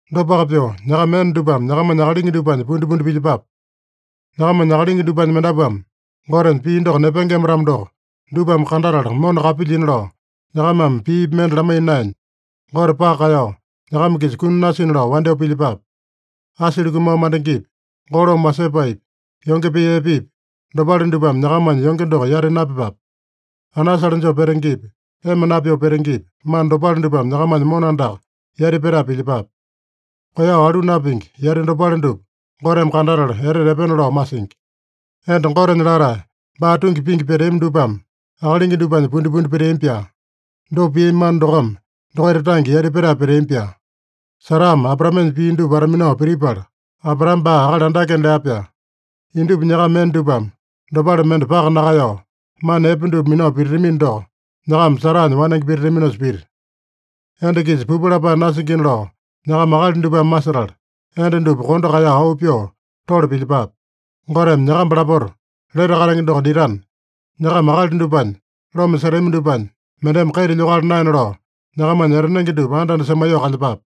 Dopaka pyoo, nyakama enda dupame nyakamanya akalingi dupanya pundipundi pilyepape. Nyakamanya akalingi dupanya mendapuame Gotenya pii doko nepengema-tamo doko, dupame kandatala mona kapilyina lao, nyakamame piipi mende lamaiya naenya, Gote paka kaeyao, nyakama-kisa kuni nasina lao wandyoo pilyepape. Asili kumao mandengepi, golome wasepaepi, yonge pee epepi, dopale dupame nyakamanya yonge doko yati napyepape. Anasale joo petengepi, ema napyoo petengepi, mana dopale dupame nyakamanya mona andaka yati petae pilyepape. Koeyao alu napingi yati dopale dupa Goteme kandatala etete epena lao masingi. Enda Gotenya latae, baa tungi pingi peteami dupame akalingi dupanya pundipundi peteami-pyaa. Dopa piami mana dokome dokaita tange yati petae peteami-pyaa. Sarame Abraamenya pii dupa wata-minao pitipala, Abraame baa akali andakena lea-pyaa. Indupa nyakama enda dupame dopale mende paka nakaeyao, mana epe dupa minao pititamino doko, nyakama Saranya wanenge pititaminosa pita. Enda-kisa pupu lapae nasingina lao nyakama akali dupame masetala, enda dupa kondo kaeyao auu pyoo tole pilyepape. Goteme nyakamba lapota lete katenge doko ditana, nyakama akali dupanya loma setami dupanya mendeme kaita lyokala naena lao, nyakamanya etanenge dupa anda-anda semaiyoo kalyepape.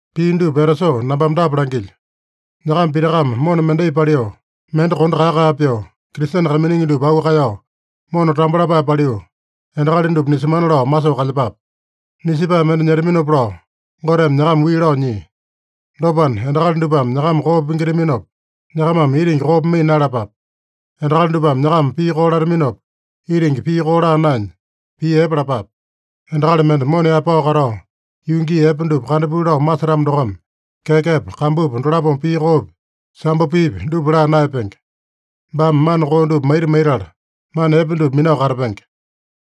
Pii dupa etasoo nambame dapa langilyo: Nyakama pitakame mona mendai paliu, mende kondo kae-kae pyoo, Kristene kaiminingi dupa auu kaeyao, mona tambo lapae paliu, endakali dupa nisemana lao masoo kalyepape. Nisepae mende nyetaminopa lao Goteme nyakama wii lao nyia. Dopana, endakali dupame nyakama koo pingitaminopa, nyakamame itingi koo pimaiya naeyalapape. Endakali dupame nyakama pii koo lataminopa, itingi pii koo laa naenya, pii epe lapape. “Endakali mende mona yaepao katao, yuu gii epe dupa kandapuli lao masetamo dokome kekepa, kambupa dolapome pii koopi, sambo piipi, dupa laa naeyapenge. Baame mana koo dupa maita maitala, mana epe dupa minao katapenge.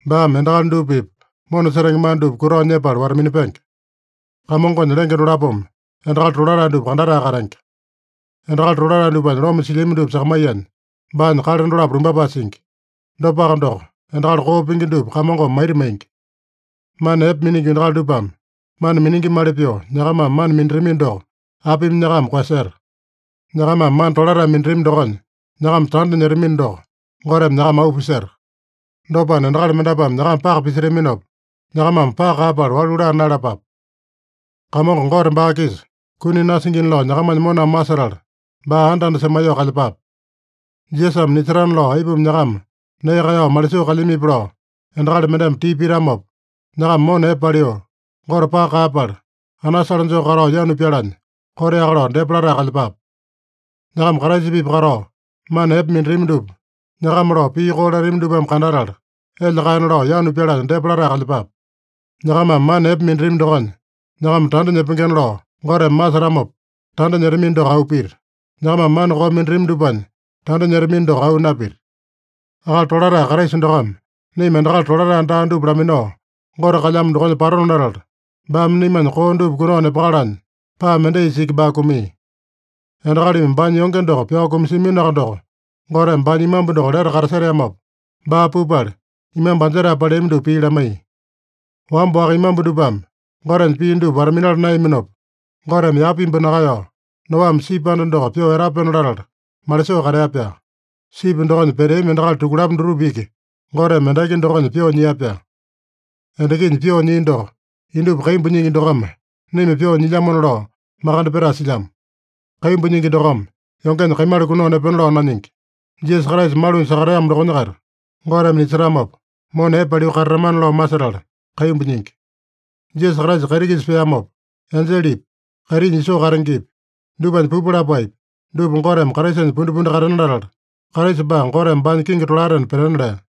Baame endakali dupa-pipa mona setenge mana dupa kutao nyepala wata-minapenge. Kamongonya lenge dolapome endakali tolatae dupa kandatae katenge. Endakali tolatae dupanya loma silyami dupa sakamaiyanya, baanya kale dolapo lumbapae singi. Dopaka doko, endakali koo pingi dupa Kamongome maita maingi.” Mana epe miningi endakali dupame mana miningimali pyoo nyakamame mana minatamino doko, apimi nyakama koeyaseta? Nyakamame mana tolatae minatami dokonya nyakama tanda nyetamino doko, Goteme nyakama auu piseta. Dopana, endakali mendapuame nyakama paka pisetaminopa, nyakamame paka kaeyapala walu laa naeyalapape. Kamongo Gote baa-kisa kuni nasingina lao nyakamanya moname masetala, baa anda-anda semaiyoo kalyepape. Jisasame nisetana lao aipuma nyakama nee kaeyao malisoo kalyamipi lao endakali mendeme tipa pitamopa, nyakama mona epe paliu, Gote paka kaeyapala, anasale joo katao yanu pyalanya, koteaka lao depa latae kalyepape. Nyakama Kraisa-pipa katao mana epe minatami dupa nyakama lao pii koo latami dupame kandatala, elya kaena lao yanu pyalanya depa latae kalyepape. Nyakamame mana epe minatami dokonya nyakama tanda nyepengena lao Goteme masetamopa tanda nyetamino doko auu pita. Nyakamame mana koo minatami dupanya tanda nyetamino doko auu napita. Akali tolatae Kraisa dokome naima endakali tolatae daa dupa laminao, Gote kalyamo dokonya patona latala, baame naimanya koo dupa kunao nepakalanya paa mendaisa iki baa kumia. Endakalimi baanya yonge doko pyao kumasiaminoaka doko, Goteme baanya imambu doko lete kataseteamopa, baa pupala, imambu anjetae paleami dupa pii lamaiya. Wamba-waka imambu dupame Gotenya pii dupa wata-minala naeyaminopa, Goteme yapa imbu nakaeyao, Noame sipi anda doko pyoo etapena latala malisoo katea-pyaa. Sipi dokonya peteami endakali tukulapo dutupa iki Goteme endaki dokonya pyoo nyia-pyaa. Endakinya pyoo nyia doko, indupa kaimbu nyingi dokome naima pyoo nyilyamona lao makande petae silyamo. Kaimbu nyingi dokome yongenya kaimala kunao nepena lao nanyingi. Jisasa Kraisa malunya sakateamo dokonya-kaita Goteme nisetamopa, mona epe paliu katatamana lao masetala kaimbu nyingi. Jisasa Kraisa kaiti-kisa peamopa, enjelepi, kaitinya isoo katengepi, dupanya pupu lapaepi, dupa Goteme Kraisanya pundipundi katena latala, Kraisa baa Goteme baanya kingi tolaetena petena lea.